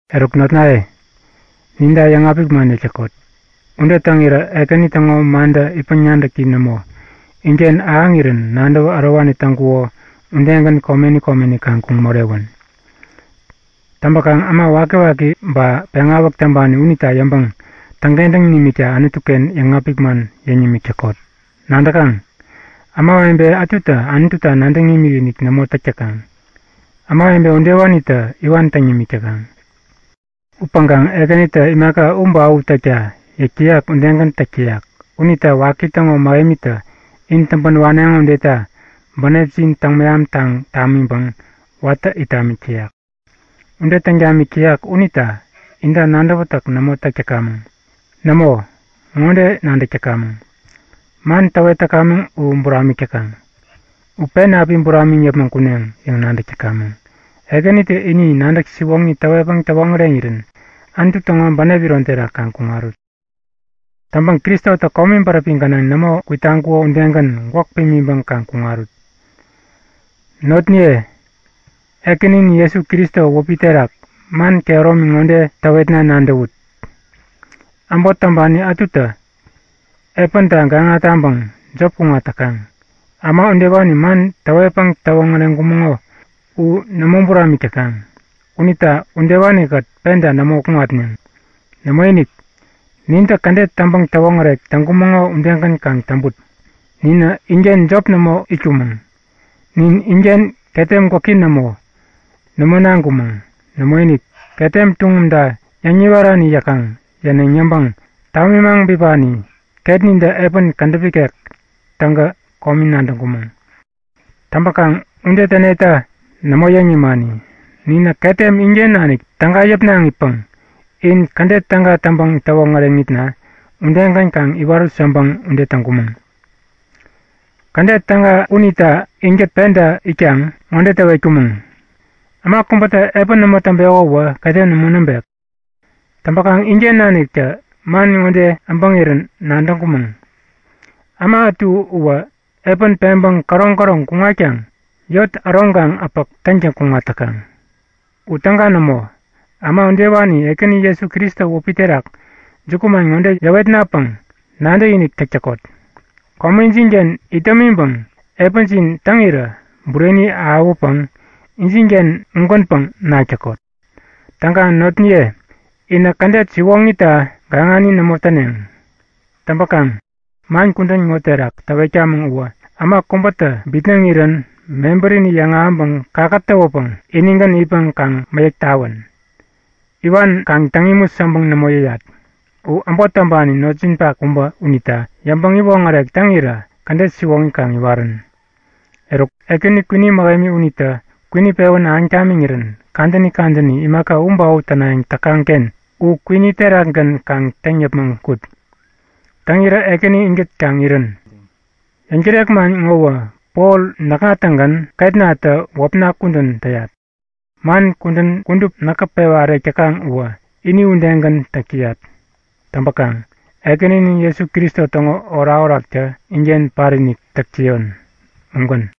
Eruk notnaye, ninta yäŋapik man yäk täkot. Ude täŋirä Ekäni täŋo mantä itpäŋ-nadäki nämo, inken ahäŋirän nadäwä ärowani täŋkuko udegän komeni komeni kaŋ kuŋ morewän. Täŋpäkaŋ äma wakiwaki ba äma peŋawäk täŋpani unita yäŋpäŋ täŋkentäŋ nimikta Anutu-ken yäŋapik man yäŋ nimik täkot. Nadäkaŋ? Ämawebe ätutä Anututa nadäŋ imikinik nämo täk täkaŋ. Ämawebe udewanitä iwan täŋ nimik täkaŋ. Upäŋkaŋ Ekänitä imaka u ba u täkta yäk täyak udegän täk täyak. Unita waki täŋo mähemitä in täŋpän waneŋo udeta bänepjin mehamtaŋ tamiŋpäŋ watä it tamik täyak. Ude täŋ tamik täyak unita inta nadäwätäk nämo täk täkamäŋ. Nämo, ŋode nadäk täkamäŋ; Man täwet täkamäŋ u buramik täkaŋ. U pen api buramiŋ yäpmäŋ kuneŋ yäŋ nadäk täkamäŋ. Ekänitä ini nadäk siwoŋi täwetpäŋ täwoŋäreŋirän Anutu täŋo bänep iron terak kaŋ kuŋarut. Täŋpäŋ Kristotä komi bäräpi gänaŋ nämo kwitaŋkuko udegän gwäk pimiŋpäŋ kaŋ kuŋarut. Notniye, Ekäninin Jesu Kristo wäpi terak man kehäromi ŋode täwetna nadäwut; Äbot täŋpani ätutä epänta gaŋa taŋpäŋ jop kuŋat täkaŋ. Äma udewani man täwetpäŋ täwoŋäreŋkumäŋo u nämo buramik täkaŋ. Unita udewani-kät penta nämo kuŋatneŋ. Nämoinik! Nintä kädet täŋpäŋ-täwoŋärek täŋkumäŋo udegän kaŋ täŋput. Ninä inken jop nämo itkumäŋ. Nin inken ketem gwäki nämo, nämo naŋkumäŋ. Nämoinik. Ketem tuŋumta yäŋ-niwarani yäkaŋ, yäneŋ yäŋpäŋ tamimaŋ bipani ketnintä epän kädäp ikek täŋkä komi nadäŋkumäŋ. Täŋpäkaŋ ude täneta nämo yäŋ nimani. Ninä ketem inken nanik täga yäpnaŋipäŋ in kädet täga täŋpäŋ-täwoŋäreŋitna udegän kaŋ iwarut yäŋpäŋ ude täŋkumäŋ. Kädet täga unita inkät penta itkaŋ ŋode täwetkumäŋ; Äma kubätä epän nämo täŋpeko uwä, ketem nämo näŋpek. Täŋpäkaŋ inken naniktä man ŋode äbäŋirän nadäŋkumäŋ; Äma ätu uwä epän peŋpäŋ käroŋ-käroŋ kuŋatkaŋ yot äroŋkaŋ-äpäk täŋtäŋ kuŋat täkaŋ. U täga nämo! Äma udewani Ekäni Jesu Kristo wäpi terak jukuman ŋode yäwetnapäŋ nadäkinik täk täkot; Komejin-ken itdämiŋpäŋ epänjin täŋirä bureni ahäwäpäŋ injinken ugänpäŋ nak täkot. Täŋkaŋ notniye, inä kädet siwoŋita gaŋani nämo täneŋ. Täŋpäkaŋ man kudän ŋo terak täwetkamäŋ uwä äma kubätä bitnäŋirän mebärini yäŋahäŋpäŋ kakätäwäpäŋ inigän itpäŋ kaŋ mäyäk tawän. Iwan kaŋ täŋ imut yäŋpäŋ nämo yäyat. U äbot täŋpani notjinpak kubä unita yäŋpäŋ-iwoŋärek täŋirä kädet siwoŋi kaŋ iwarän. Eruk, Ekäni kwini mähemi unitä kwini pewän ahäŋ tamiŋirän kadäni kadäni, imaka u ba u tänayäŋ täkaŋ-ken u kwini terakgän kaŋ täŋ yäpmäŋ kut. Täŋirä Ekäni inkät kaŋ irän. Yäŋtärek man ŋowä Pol näkŋa-tägän ketnatä wäpna kudän täyat. Man kudän kudup näkä pewa ärek täkaŋ uwä ini udegän täk täyat. Täŋpäkaŋ Ekäninin Jesu Kristo täŋo orakoraktä inken patinik täk täyon. Ugän.